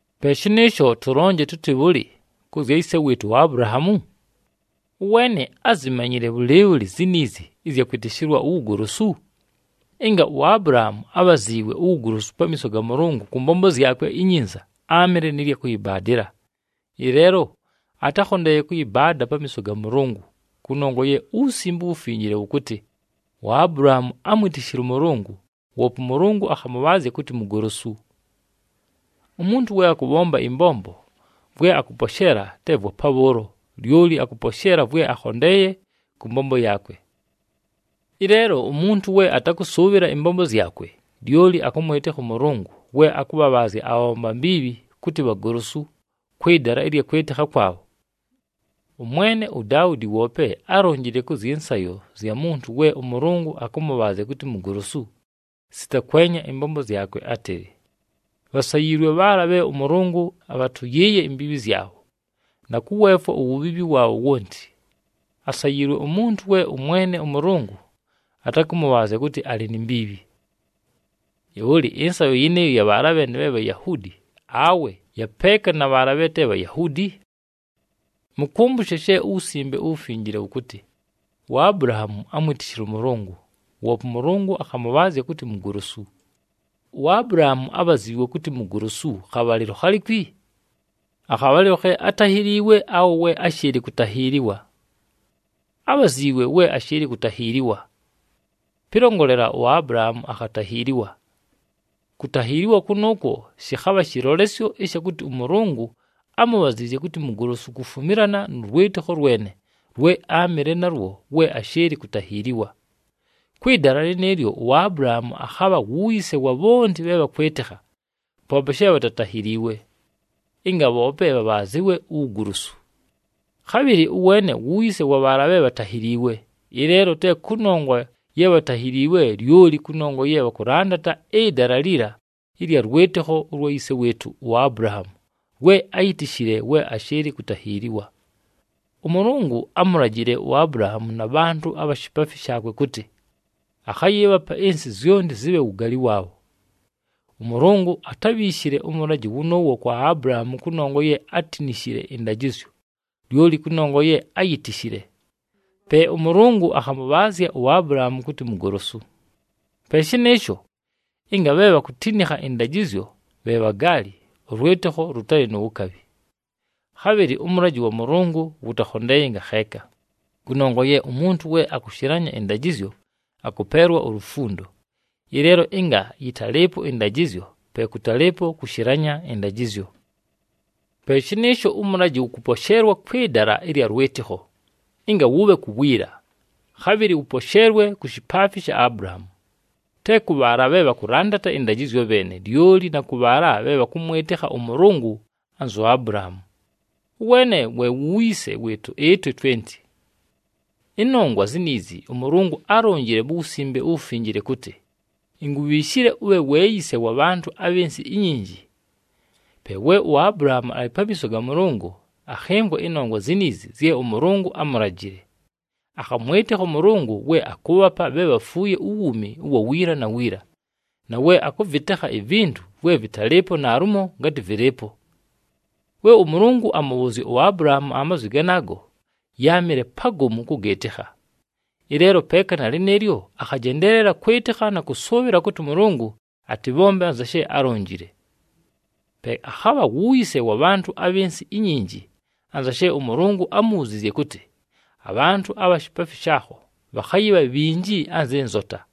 Pe shɨnɨɨsho, tʉlonje tʉtɨ bhʉlɨ kʉ zya yise wɨɨtʉ uAbulahaamu? Ʉweene ázimanyile bhʉlɨɨbhʉlɨ ziniizi ɨzya kwɨtɨshɨlwa uwugolosu? Ɨnga uAbulahaamu ábhaziiwe uwugolosu pamiiso ga Mʉlʉngʉ kʉ mbombo zyakwe inyinza, áamɨle nɨ lya kʉyɨbaadɨla. Ɨleelo atákhondeeye kʉyɨbaada pamiiso ga Mʉlʉngʉ, kʉnongwa ye uWusimbe uWufinjile wʉkʉtɨ, “UAbulahaamu ámwitishile ʉMʉlʉngʉ, woope ʉMʉlʉngʉ akhamʉbhaazya kʉtɨ mugolosu.” Umuntu we akʉbhomba ɨmbombo, vwe akʉposheela te vwa pabhʉʉlo, lyoli akʉposheela vwe akhondeeye kʉ mbombo yaakwe. Ɨleelo umuntu we atakʉsʉʉbhɨla ɨmbombo zyakwe, lyoli akʉmwɨtɨkha ʉMʉlʉngʉ we akʉbhabhaazya abhabhomba mbiibhi kʉtɨ bhagolosu, kwɨ dala ɨlya kwɨtɨkha kwabho. Ʉmwene uDaudi woope álonjile kʉ zyɨ nsayo zya muntu we ʉMʉlʉngʉ akʉmʉbhaazya kʉtɨ mugolosu, sita kwenya ɨmbombo zyakwe, átɨlɨ, “Bhasayiilwe bhaala bhe ʉMʉlʉngʉ abhatʉyɨɨye imbiibhi zyabho, na kʉweefwa uwubhiibhi waabho wonti. Asayiilwe umuntu we ʉMwene ʉMʉlʉngʉ atakʉmʉbhaazya kʉtɨ alɨ ni mbiibhi.” Bhʉlɨ, ɨnsayo yɨnɨɨyo ya bhaala bheene bhe Bhayahuudi, awe ya peeka na bhaala bhe te Bhayahuudi? Mʉkʉmbʉshe she uWusimbe uWufinjile wʉkʉtɨ, “UAbulahaamu ámwitishile ʉMʉlʉngʉ, woope ʉMʉlʉngʉ akhamʉbhaazya kʉtɨ mugolosu.” UAbulahaamu ábhaziiwe kʉtɨ mugolosu khabhalɨlo khalikwi? Akhabhalɨlo khe atáhiliiwe awe we áshɨɨlɨ kutahiiliwa? Ábhaziiwe we ashɨɨlɨ kutahiiliwa. Pɨlongolela, uAbulahaamu akhatahiiliwa. Kutahiiliwa kʉnʉʉkwo shɨkhabha shɨlolesyo ɨsha kʉtɨ ʉMʉlʉngʉ ámubhaziizye kʉtɨ mugolosu kufumilana nʉ lwɨtɨkho lwene lwe áamɨle nalwo we ashɨɨlɨ kutahiiliwa. Kwɨ dala lɨnɨɨlyo uAbulahaamu akhabha wu yise wa bhonti bhe bhakwɨtɨkha, poope she bhatatahiliiwe, ɨnga bhoope bhabhaazɨwe uwugolosu. Khabhɨlɨ ʉweene wu yise wa bhaala bhe bhatahiliiwe, ɨleelo te kʉnongwa ye bhatahiliiwe, lyoli kʉnongwa ye bhakʉlandata ɨdala liliila ɨlya lwɨtɨkho ʉlwa yise wɨɨtʉ uAbulahaamu lwe áyitishile we ashɨɨlɨ kutahiiliwa. ɄMʉlʉngʉ ámulajile uAbulahaamu na bhantʉ abha shipaafi shaakwe kʉtɨ, akhayɨɨbhapa ɨnsɨ zyonti zɨbhe wugaali waabho. ɄMʉlʉngʉ atábhiishile ʉmʉlajɨ wʉnʉʉwo kwa Abulahaamu kʉnongwa ye átinishile ɨndajɨzyo, lyoli kʉnongwa ye áyitishile. Pe ʉMʉlʉngʉ akhamʉbhaazya uAbulahaamu kʉtɨ mugolosu. Pe shɨnɨɨsho, ɨnga bhe bhakutinikha ɨndajɨzyo bhe bhagaali, ʉlwɨtɨkho lʉtalɨ nu wukabhi. Khabhɨlɨ ʉmʉlajɨ wa Mʉlʉngʉ wʉtakhondeeye ngakheeka, kʉnongwa ye umuntu we akushilanya ɨndajɨzyo akʉpeelwa ulufundo. Ɨleelo ɨnga yɨtalɨɨpo ɨndajɨzyo, pe kʉtalɨɨpo kushilanya ɨndajɨzyo. Pe shɨnɨɨsho ʉmʉlajɨ wʉkʉposheelwa kwɨ dala ɨlya lwɨtɨkho, ɨnga wʉbhe ku wiila, khabhɨlɨ wʉposheelwe ku shipaafi sha Abulahaamu, te kʉ bhaala bhe bhakʉlandata ɨndajɨzyo bheene, lyoli na kʉ bhaala bhe bhakʉmwɨtɨkha ʉMʉlʉngʉ anzu Abulahaamu. Ʉweene we wu yise wɨɨtʉ ɨtwe twenti. Ɨnongwa ziniizi ʉMʉlʉngʉ álonjile mu Wusimbe uWufinjile kʉtɨ, “Inkubhiishile ʉbhe we yise wa bhantʉ abhɨ nsɨ inyinji.” Pe we uAbulahaamu alɨ pamiiso ga Mʉlʉngʉ, akhɨmvwa ɨnongwa ziniizi zye ʉMʉlʉngʉ ámulajile. Akhamwɨtɨkha ʉMʉlʉngʉ we akʉʉbhapa bhe bhafuuye uwuumi ʉwa wiila na wiila, na we akʉvɨtekha ivintu vwe vɨtalɨɨpo naalumo ngatɨ vɨlɨɨpo. We ʉMʉlʉngʉ amʉbhʉʉzya uAbulahaamu amazwi ganaago, yáamɨle pagomu kʉgɨɨtɨkha. Ɨleelo peeka na lɨnɨɨlyo, akhajendeelela kwɨtɨkha na kʉsʉʉbhɨla kʉtɨ ʉMʉlʉngʉ atɨbhombe anza she álonjile. Pe akhabha wu yise wa bhantʉ abhɨ nsɨ inyinji, anza she ʉMʉlʉngʉ ámubhuziizye kʉtɨ, “Abhantʉ abha shipaafi shaakho bhakhayɨbha bhinji anzɨ nzota.”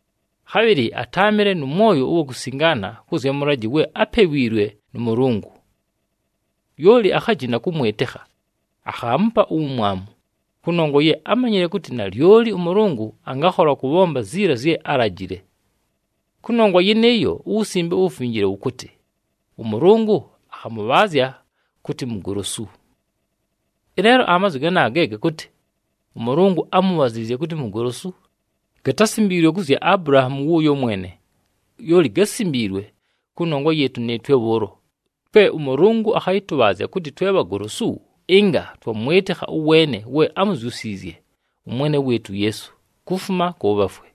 Khabhɨlɨ atáamɨle nʉ mwoyo ʉwa kusingaana kʉ zya mʉlajɨ we ápewiilwe nʉ Mʉlʉngʉ. Lyoli akhajina kʉmwɨtɨkha, akhaamupa uwumwamu, kʉnongwa ye ámanyile kʉtɨ nalyoli ʉMʉlʉngʉ angakhola kʉbhomba ziila zye álajile. Kʉnongwa yɨnɨɨyo, uWusimbe uWufinjile wʉkʉtɨ, ʉMʉlʉngʉ akhamʉbhaazya kʉtɨ mugolosu. Ɨleelo amazwi ganaaga ge gakʉtɨ, “ɄMʉlʉngʉ ámubhaziizye kʉtɨ mugolosu,” gatásimbiilwe kʉ zya Abulahaamu wʉʉyo mwene, lyoli gásimbiilwe kʉnongwa yɨɨtʉ nɨɨtwe bhʉʉlo, twe ʉMʉlʉngʉ akhayɨtʉbhaazya kʉtɨ twe bhagolosu, ɨnga twamwɨtɨkha ʉweene we ámuzyusiizye ʉMwene wɨɨtʉ uYeesu, kufuma kʉ bhafwe.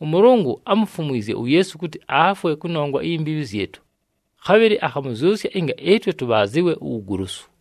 ɄMʉlʉngʉ ámufumwizye uYeesu kʉtɨ afwe kʉnongwa iyi mbiibhi zyɨtʉ, khabhɨlɨ akhamʉzyʉsya ɨnga ɨtwe tʉbhaazɨwe uwugolosu.